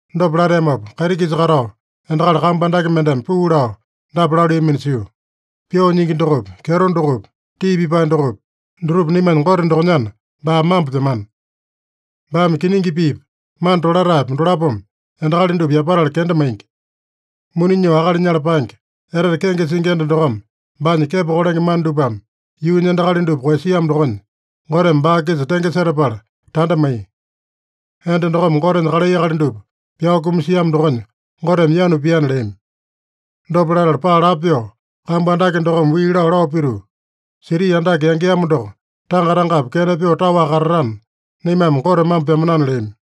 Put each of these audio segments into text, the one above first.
Dopa lateamopa, kaiti-kisa katao endakali kambu andake mendeme puu lao dapa laluiyamino sio: “Pyoo nyingi dokopi, kyeto dokopi, tii pipae dokopi, dutupa naimanya Gote dokonyana, baa mambo pyamana. Baame kiningi piipa, mana tolataepa, dolapome endakali dupa yapatala kenda maingi. Muni nyoo akali nyala paenge, etete kenge singi enda dokome baanya kepo kolenge mana dupame yuunya endakali dupa koeyasiamo dokonya, Goteme baa-kisa tenge setapala tanda maiya. Enda dokome Gotenya kalai akali dupa pyao kumasiamo dokonya Goteme yanu piana” leami. Dopa latala, paa lapo pyoo kambu andake dokome wii lao, lao pituu, “Siti andake yangeamo doko tanga-tangapi kena pyoo taowaka katatana, naimame Gote mambo pyamanana” leami.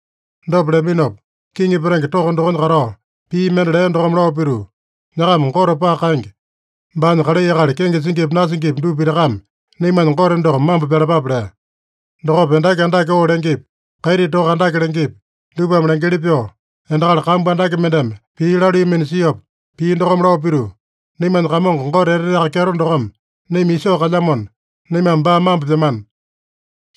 Dopa leaminopa, kiŋi petenge toko dokonya katao, pii mende lea dokome lao pituu, “Nyakama Gote paka kaenge, baanya kalai akali kenge singipi nasingipi dupa pitakame naimanya Gote doko mambo pyalapape” lea. Dokopa endaki andake oo lengepi, kaiti toka andake lengepi, dupame lengeli pyoo, endakali kambu andake mendeme pii laluiyamino siopa, pii dokome lao pituu, “Naimanya Kamongo Gote Eteteaka Kyeto dokome naima isoo kalyamona, naimame baa mambo pyamana.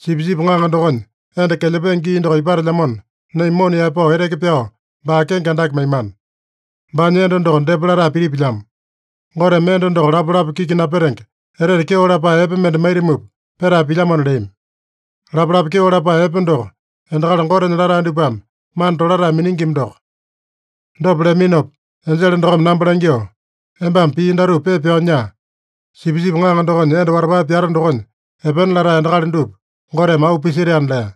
Sipisipi Ŋaŋa dokonya enda kelyapenge gii doko ipatelyamona, naima mona yaepao eteke pyao baa kenge andake maimana. Baanya enda doko depa latae pitipilyamo. Goteme enda doko lapalapa kiki napetenge, etete kyeo lapae epe mende maitamupa petae pilyamona” leami. Lapalapa kyeo lapae epe doko, endakali Gotenya latae dupame mana tolatae miningima doko. Dopa leaminopa enjele dokome namba langyoo, “Embame pii datupa pepa pyao nyaa: ‘Sipisipi Ŋaŋa dokonya enda watapae pyata dokonya epena latae endakali dupa Goteme auu pisetaena’” lea.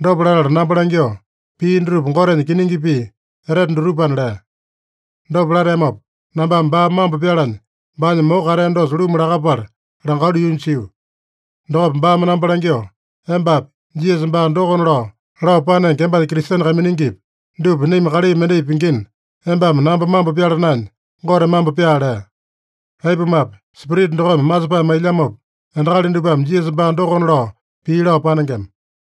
Dopa latala namba langyoo, “Pii dutupa Gotenya kiningi pii etete dutupana” lea. Dopa lateamopa, nambame baa mambo pyalanya baanya moko katea dosa luma lakapala langalu yuunya sio. Dokopa baame namba langyoo, “Embapi, Jisasa baa dokona lao, lao panenge embanya Kristene kaiminingipi, dupa naima kalai mendai pingina, embame namba mambo pyala naenya, Gote mambo pyaa” lea. Aipumape, Spirita dokome masepae mailyamopa, endakali dupame Jisasa baa dokona lao pii lao panengema.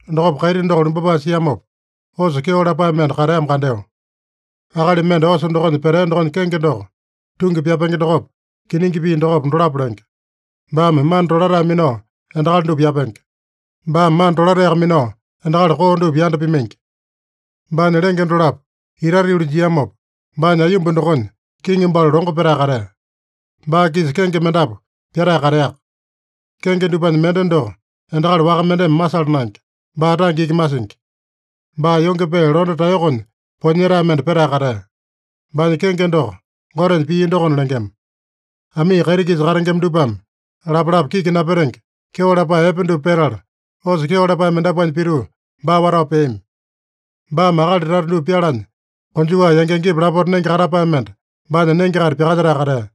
Dokopa kaiti doko lumbapae siamopa, osa kyeo lapae mende kateamo kandeo. Akali mende osa dokonya petea dokonya kenge doko, Tungi Pyapenge dokopa, Kiningi Pii dokopa, dolapo lenge. Baame mana tolatae minao endakali dupa yapenge. Baame mana tolataeyaka minao endakali koo dupa yanda pimaingi. Baanya lenge dolapo itate yuli jiamopa, baanya aiyomba dokonya kiŋi balu longo petae katea. Baa-kisa kenge mendapu pyatae kateaka. Kenge dupanya mende doko endakali waka mendeme masala naenge. Baa tange iki masingi. Baa yonge pee londe taeyokonya poeyanyetae mende petae katea. Baanya kenge doko Gotenya Pii dokona lengema. Amii kaiti-kisa katengema dupame lapalapa kiki napetenge, kyeo lapae epe dupa petala, osa kyeo lapae mendapuanya pituu, baa watao peami. Baame akali tata dupa pyalanya, konjuwa yangi-yangipa lapota nenge katapae mende baanya nenge-kaita pyakalyetae katea.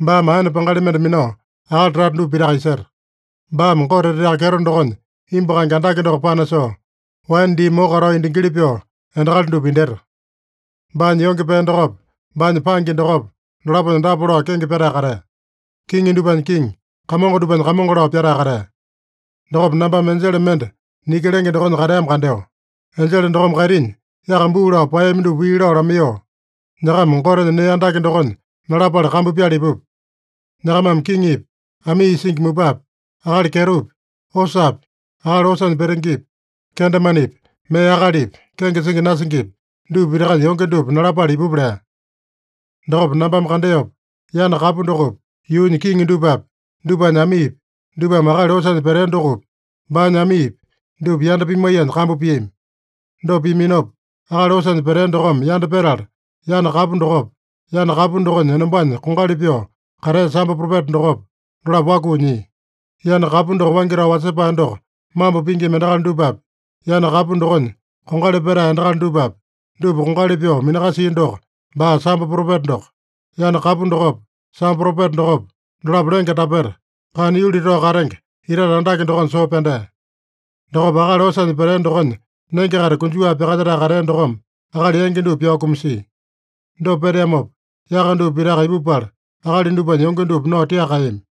Baame aene pangali mende minao, akali tata dupa pitaka iseta. Baame Gote Eteteaka Kyeto dokonya imbu kaenge andake doko panasoo, waene dii moko katao indingili pyoo, endakali dupa indyeta. Baanya yonge pee dokopa, baanya pangi dokopa, dolaponya dapa lao kenge pyatae katea: Kiŋi dupanya Kiŋi, kamongo dupanya Kamongo lao pyatae katea. Dokopa nambame enjele mende niki lenge dokonya kateamo kandeo. Enjele dokome kaitinya yaka buu lao paeyami dupa wii lao lamaiyoo, “Nyakama Gotenya nee andake dokonya nalapale kambu pyala ipupa. Nyakamame kiŋipi, amii isingi mupapi, akali kyetopi, osapi, akali osanya petengepi, kendemanepi, mee akalipi, kenge singi nasingipi, dupa pitakanya yonge dupa nalapale ipupa” lea. Dokopa nambame kandeopa, yana kapu dokopi, yuunya kiŋi dupapi, dupanya amiipi, dupame akali osanya petea dokopi, baanya amiipi, dupa yanda pimaiyanya kambu piami. Dopa piaminopa, akali osanya petea dokome yanda petala, yana kapu dokopa, yana kapu dokonya enombanya kongali pyoo katea sambo propeta dokopa, dolapo wakuu nyia. Yana kapu doko waingi tao wasepae doko mambo pingima endakali dupapi, yana kapu dokonya kongali petae endakali dupapi, dupa kongali pyoo minakasia doko, baa sambo propeta doko. Yana kapu dokopa, sambo propeta dokopa, dolapo lenge tapeta, kana yuli tao katenge itate andake dokonya soo pyandea. Dokopa akali osanya petea dokonya nenge-kaita konjuwa pyakalyetae katea dokome akali yangi dupa pyao kumasia. Dopa peteamopa, yaka dupa pitaka ipupala, akali dupanya yonge dupa nao tiaka kaeyami.